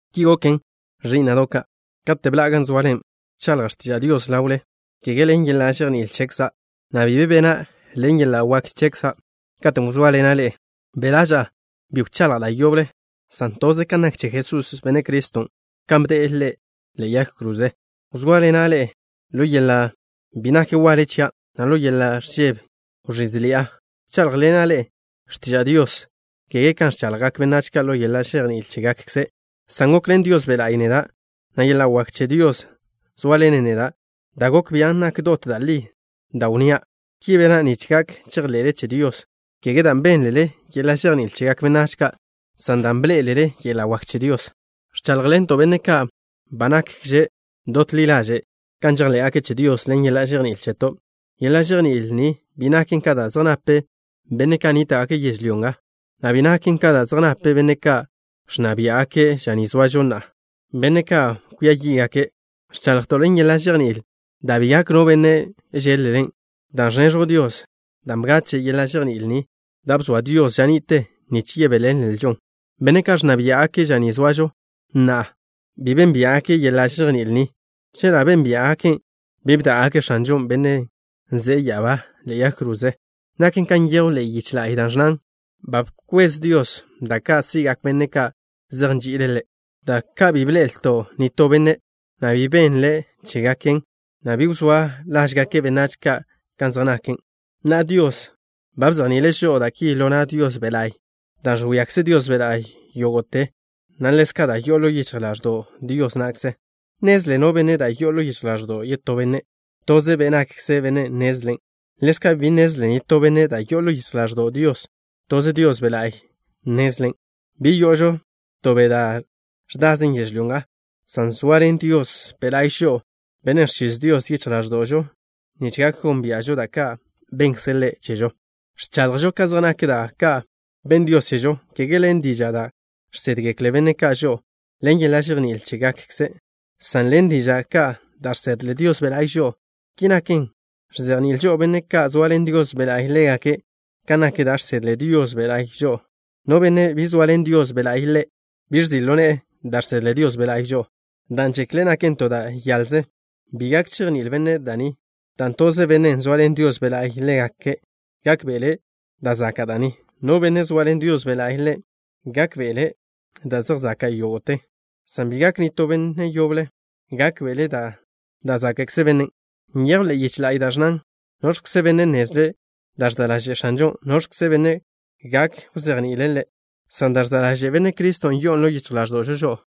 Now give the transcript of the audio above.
Ki goken, ẕí'na'do' ka', katen' bḻa'a gan zoale. Bchaḻja' x̱tiža' Dios ḻawle, kege ḻen yeḻa' žejní'il chekza', na' bi be bena' ḻen yeḻa' wak chekza'. Katen' wzóaḻena' ḻe'e, be' ḻaža'a bi wchaḻja' da' yoble, san toze kan nak che Jesús, Benne' Criston', kan bde'e ḻe'e yag kroze. Wzóaḻena' ḻe'e ḻo yeḻa' bi nak waḻe chia', na' ḻo yeḻa' ẕžebe wẕízeḻi'a. Bcháḻjḻena' ḻe'e x̱tiža' Dios, kege kan ẕchaḻjgak benách ka' ḻo yeḻa' žejní'il chégakkze', san gokḻen Dios Be' La'y neda', na' yeḻa' wak che Dios wzóaḻenen neda', da' gok bian' nak dot da' li da' wnnía'. Ki bena' nich gak chejḻe'le che Dios, kege dan' bénlele yeḻa' žejní'il chegak benách ka', san dan' bḻé'elele yeḻa' wak che Dios. Ẕcháḻjḻento' benne' ka' ba nakže dot ḻi ḻaže' kan žejḻé'gake' che Dios ḻen yeḻa' žejní'il cheto'. Yeḻa' žejní'il ni bi naken ka da' zej nape benne' ka' nníta'gake' yežlyó nga, na' bi naken ka da' zej nape benne' ka' ẕnna biá'gake' ža ni zoažo na'a, benne' ka' kwia yí'gake'. Ẕchaḻjto' ḻen yeḻa' žejní'il da' bi gak no benne' žeḻ-len', dan' ẕneẕjw Dios, dan' bgache' yeḻa' žejní'il ni da' bzoa Dios ža ni'te nich yebéḻenlžon. Benne' ka' ẕnna biá'gake' ža ni zoažo na'a bi bénbia'gake' yeḻa' žejní'il ni. Chela' bénbia'gaken', bi bdá'gake' X̱anžon', Benne' ze'e ya'abá, ḻe'e yag kroze. Naken kan nyejw ḻe'e yiche la'y, da' ẕnnan: Ba bkwez Dios da' ka' si'gak benne' ka' zej nži'ile' Ḻe', da' ka' bi bḻe'el nitó benne', na' bi benle' chégaken, na' bi wzá' ḻáže'gak benách ka' kan zej naken. Na'a, Dios ba bzejni'ile' žo'o da' ki ḻo na' Dios Be' La'y, dan' ẕwíakze Dios Be' La'y yógo'te, na' ḻezka' da' yo'o ḻo yichj ḻáẕdo'w Dios na'kze. ¿Nnezle no benne' da' yo'o ḻo yichj ḻáẕdo'w yetó benne'? Toze be' nakkze bennen' nnezlen. Ḻezka', bi nnezle nitó benne' da' yo'o ḻo yichj ḻáẕdo'w Dios. Toze Dios Be' La'y nnezlen'. Bi yo'ožo to be' da' ẕdazen yežlyó nga, san zoaḻen Dios Be' La'y žo'o, Bennen' ẕchiz Dios yichj ḻáẕdo'žo nich gak gónbia'žo da' ka' bennkze' Ḻe' chežo. Ẕchaḻjžo ka zej nak da' ka' benn Dios chežo, kege ḻen diža' da' žsédgekle benne' ka' žo'o ḻen yeḻa' žejní'il chégakkze', san ḻen diža' ka' da' žsedle Dios Be' La'y žo'o. Ki naken, ẕzejni'ilžo benne' ka' zoaḻen Dios Be' La'y ḻégake' kan nak da' žsedle Dios Be' La'y žo'o. No benne' bi zoaḻen Dios Be' La'y ḻe', bi ẕzi' ḻo ne'e da' žsedle Dios Be' La'y žo'o, dan' žekle' naken to da' yaḻze. Bi gak chejní'il bennen' da' ni, dan' toze bennen' zoaḻen Dios Be' La'y ḻe' gak gákbe'ele' da' zaka' da' ni. No benne' zoaḻen Dios Be' La'y ḻe' gak gákbe'ele' da' zej zaka' yógo'te, san bi gak nitó benne' yoble gákbe'ele' da' záka'kze bennen'. Nyejw ḻe'e yiche la'y da' ẕnnan: ¿Noẕkze benne' nnezle' da' ẕza' ḻaže' X̱anžo? ¿Noẕkze benne' gak wzejni'ile' Ḻe'? San da' ẕza' ḻaže' Benne' Criston' yo'on ḻo yichj ḻáẕdo'žo žo'o.